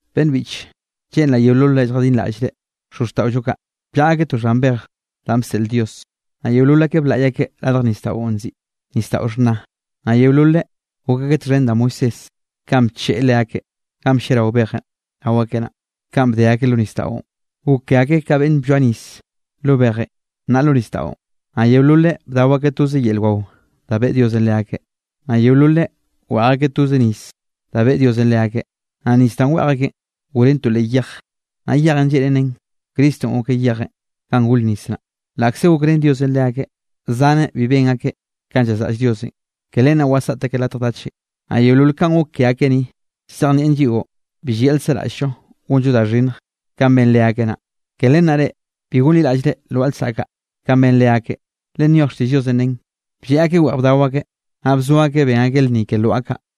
Beꞌnn biꞌche, lleꞌnraꞌ yeololre lljadinraꞌllre xozxtaꞌollo kaꞌ bllaꞌa akeꞌ to xhan bej danꞌ bseꞌl Dios, naꞌ yeolol akeꞌ blaꞌy akeꞌ radj nisdaꞌon nziꞌi Nisdaꞌo Xhna. Naꞌ yeololeꞌ gok akeꞌ txhen da Moisésenꞌ kanꞌ bcheꞌe leakeꞌ ganꞌ blliarao bejenꞌ rao akeꞌ naꞌ, kanꞌ bde akeꞌ lo nisdaꞌon, gok ke akeꞌ ka beꞌnn blloa nis lo bejenꞌ, naꞌ lo nisdaꞌon. Naꞌ yeololeꞌ bdao akeꞌ toze yel wao da beꞌe Diosenꞌ leakeꞌ. Naꞌ yeololeꞌ weꞌj akeꞌ toze nis da beꞌe Diosenꞌ leakeꞌ. Naꞌ nis danꞌ weꞌj akeꞌn goren to leꞌ yej, naꞌ yejenꞌ lleꞌnen nen Cristonꞌ gokeꞌ yejenꞌ ganꞌ gor nis naꞌ. Laꞌkze gokrén Diosenꞌ leakeꞌ, zaneꞌ bi ben akeꞌ kanꞌ llazraꞌll Diosenꞌ, ke len naꞌ wasaꞌt akeꞌ latj dachenꞌ. Naꞌ yeolol kanꞌ gok ke akeꞌ ni, llzejnieꞌn lliꞌo bi llayaꞌl seraꞌll-llo gonllo da xhinnj kanꞌ ben leakeꞌ naꞌ. Ke len naꞌ reꞌ, bi gonliraꞌllre lwaꞌa lsaꞌk kaꞌ kanꞌ ben leakeꞌ. Le nyoj xtiꞌll Diosenꞌ nen: “Blleꞌ akeꞌ weꞌj bdao akeꞌ, naꞌ bzo akeꞌ ben akeꞌ lnni ke lwaꞌa kaꞌ.”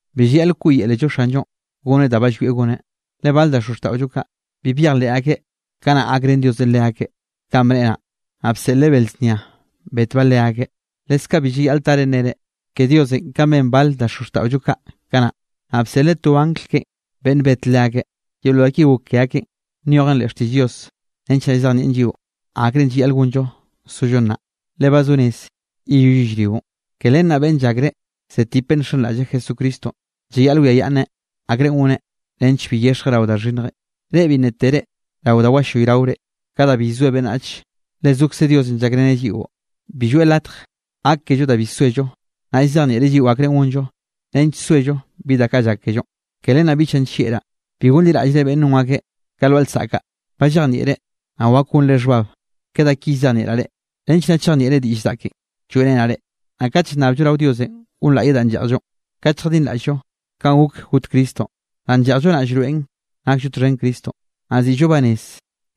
Bi llayaꞌl wkoꞌyelello Xanllonꞌ goneꞌ da ba llwieꞌ goneꞌ. Le bale da xozxtaꞌollo kaꞌ, bi byejleꞌ akeꞌ kanaꞌ gakrén Diosenꞌ leakeꞌ kanꞌ bneꞌe naꞌ, naꞌ bseꞌleꞌ bel znia betbaꞌ leakeꞌ. Leskaꞌ bi llayaꞌl tare nnere ke Diosenꞌ kanꞌ ben bale da xozxtaꞌollo kaꞌ kanaꞌ, naꞌ bseꞌleꞌ to angl keꞌe beꞌnn bet leakeꞌ. Yeolol da ki gok ke akeꞌn, nyojen leꞌ xtiꞌll Diosenꞌ nench naꞌ llzejnieꞌn lliꞌo akrenꞌ llayaꞌl gonllo zollo nnaꞌ, le ba zo rez yeyoll yellrionꞌ. Ke len naꞌ beꞌnn llakre zetipeꞌ nxenraꞌlleꞌ Jesucristonꞌ, llayaꞌl wiayaꞌnneꞌ akrenꞌ goneꞌ nench bi yexjeꞌ rao da xhinnjenꞌ. Reꞌ bi nna tere rao da wallayraore ka da bi llzoe beꞌnnach. Le zokze Diosenꞌ llakreneꞌ lliꞌo, bi lloeꞌ latj gak kello da bi soello. Naꞌ llzejnieꞌreꞌ lliꞌo akre gonllo nench soello bi da kaꞌ llak kellonꞌ. Ke len naꞌ biꞌchaꞌ nllieꞌraꞌ, bi gonliraꞌllre beꞌnn non akeꞌ ka lwaꞌa lsaꞌk kaꞌ. Ba llejnieꞌre, naꞌ wak gonre xhbab ke da ki llzejnieꞌraꞌ reꞌ, nench naꞌ chejnieꞌre diꞌll zaꞌken lloeꞌrenaꞌ reꞌ. Naꞌ kat llnnabllo rao Diosenꞌ gonlaꞌyeꞌ danꞌ lleꞌjllonꞌ kat lljadinraꞌll-llo kanꞌ gok got Cristonꞌ, danꞌ lleꞌjllo naꞌ llroeꞌn nakllo txhen Cristonꞌ, naꞌ ziꞌllo banez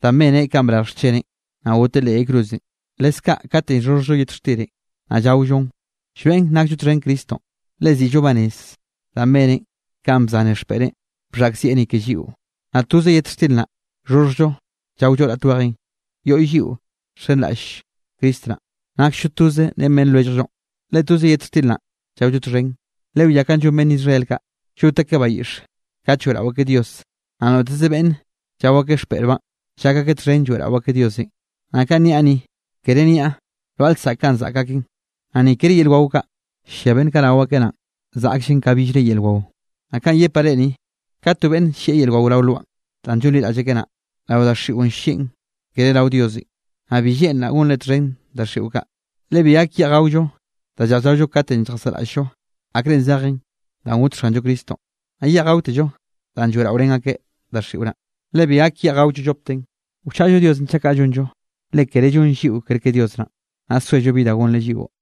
danꞌ beneꞌn kanꞌ brarj xcheneꞌn, naꞌ goteꞌ leꞌ yay cruzenꞌ. Leskaꞌ katenꞌ llxhoxhjllo yet xtirenꞌ naꞌ llaollon, llroeꞌn nakllo txhen Cristonꞌ, le ziꞌllo banez danꞌ beneꞌn kanꞌ bzaneꞌ xpeꞌreꞌn bxhaꞌkzieꞌ ni ke lliꞌo. Naꞌ toze yet xtir naꞌ llxhoxhjllo llaollo raꞌt wejenꞌ, yoꞌy lliꞌo nxenraꞌll Cristo naꞌ, naksllo toze ren beꞌnn lwelljllonꞌ, le toze yet xtir naꞌ llaollo txhen. Lewiá kanꞌ llon beꞌnn Israel kaꞌ, llot akeꞌ bayiꞌx kat lloeꞌrao akeꞌ Dios, naꞌ noteze beꞌnne llao akeꞌ xpeꞌrbaꞌn, llak akeꞌ txhen lloeꞌrao akeꞌ Diosenꞌ. Naꞌ kanꞌ niaꞌ ni, kere niaꞌ lwaꞌa lsaꞌk kaꞌn zaꞌk aken, naꞌ ni kere yel wao kaꞌ ll-llia beꞌnn kaꞌ rao aken naꞌn zaꞌkllen ka billre yel wao. Naꞌ kanꞌ llepaꞌ reꞌ ni, kat to beꞌnne ll-llieꞌ yel wao rao lwaꞌn danꞌ llonliraꞌll akeꞌ naꞌ, rao daxiꞌon ll-llieꞌn, kere rao Diosenꞌ, naꞌ bi lleꞌnraꞌ gonre txhen daxiꞌo kaꞌ. Le bi gak yeꞌj gaollo da lleꞌj llaollo katenꞌ lljasaꞌraꞌll-llo akre zejen danꞌ got Xanllo Cristonꞌ, naꞌ yeꞌj gaotello danꞌ lloeꞌraorén akeꞌ daxiꞌo naꞌ, le bi gak yeꞌj gaollo llopten. Wchaꞌllo Diosenꞌ chaꞌ kaꞌ gonllo. Le kere llonll lliꞌo kerke Dios naꞌn, naꞌ soello bi da gonreꞌ lliꞌo.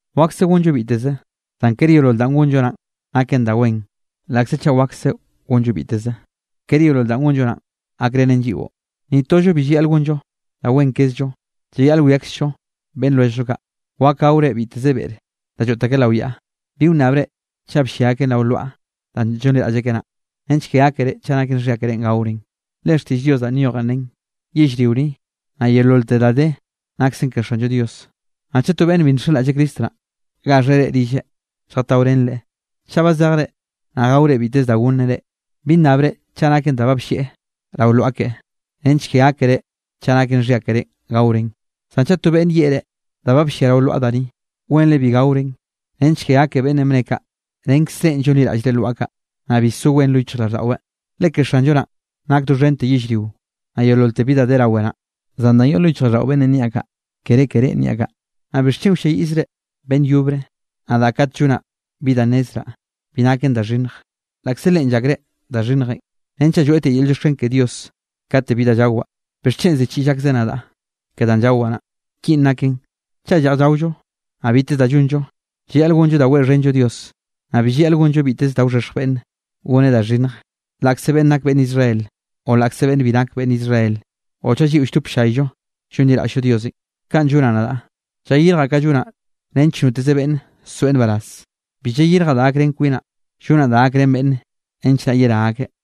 Wakse gonllo biteze, zan kere yeolol danꞌ gonllo naꞌn naken da wen; laꞌkze chaꞌ wakse gonllo biteze, kere yeolol danꞌ gonllo naꞌn gakrenen lliꞌo. Ni tollo bi llayaꞌl gonllo da wen kezllo, llayaꞌl wiakzllo beꞌnn lwelljllo kaꞌ. Wak gaore biteze beꞌr da lloꞌt akeꞌ lao yaꞌa, bi wnnabre chaꞌ bllia akeꞌn rao lwaꞌa danꞌ llonliraꞌll akeꞌ naꞌ, nench ke gákere chaꞌ naken xhia keré gaoren. Le xtiꞌll Dios danꞌ nyojen nen: “Yellrio ni, naꞌ yeololte da de naksen ke Xanllo Dios.” Naꞌ chaꞌ to beꞌnne bi nxenraꞌll Cristo naꞌ, gaxheꞌ reꞌ rilleꞌ lljataorenreꞌ, chaꞌ ba zejre, naꞌ gaore biteze da gonneꞌ reꞌ, bi nnabre chaꞌ naken da ba bllieꞌ rao lwaꞌa keꞌe, nench ke gákere chaꞌ naken xhia keré gaoren. Zan chaꞌ to beꞌnne yeꞌe reꞌ: “Da ba blliaꞌ rao lwaꞌa da ni”, wenre bi gaoren nench ke gake beꞌnnenꞌ bne kaꞌ, renkzrenꞌ llonliraꞌllre lwaꞌa kaꞌ, naꞌ bi so wen lo yichjraꞌlldaꞌweꞌ, le ke Xanllo naꞌ nak doxhente yellrio, naꞌ yeololte bi da de rawe naꞌ. Zan danꞌ yoꞌ lo yichjraꞌlldaꞌo beꞌnnenꞌ niaꞌ kaꞌ, kere ke reꞌn niaꞌ kaꞌ. Naꞌ ¿bixchen wlliayiꞌllriz beꞌnn yobre nadaꞌ kate llonaꞌ bi da nnezraꞌ bi naken da xhinnj, laꞌkze leꞌen llakreꞌn da xhinnj? Renchaꞌ lloeꞌtiaꞌ yel llioxken ke Dios kate bi da llawaꞌ, ¿bixchen ziꞌchiꞌll akzeꞌ nadaꞌ ke danꞌ llawaꞌ naꞌ? Kinꞌ naken, chaꞌ lleꞌj llaollo, naꞌ biteze da llonllo, llayaꞌl gonllo da weꞌxhenllo Dios. Naꞌ bi llayaꞌl gonllo biteze da wxhexj beꞌnne goneꞌ da xhinnj laꞌkze beꞌnn nak beꞌnn Israel, o laꞌkze beꞌnn bi nak beꞌnn Israel o chaꞌ lliꞌo lldop ll-llayllo llonliraꞌll-llo Diosenꞌ. Kanꞌ llonaꞌ nadaꞌ, llayirjaꞌ ka llonaꞌ nench noteze beꞌnne soeꞌ nbaraz. Bi llayirjaꞌ da gakrén kwinaꞌ, llonaꞌ da gakrén beꞌnne nench naꞌ yerá akeꞌ.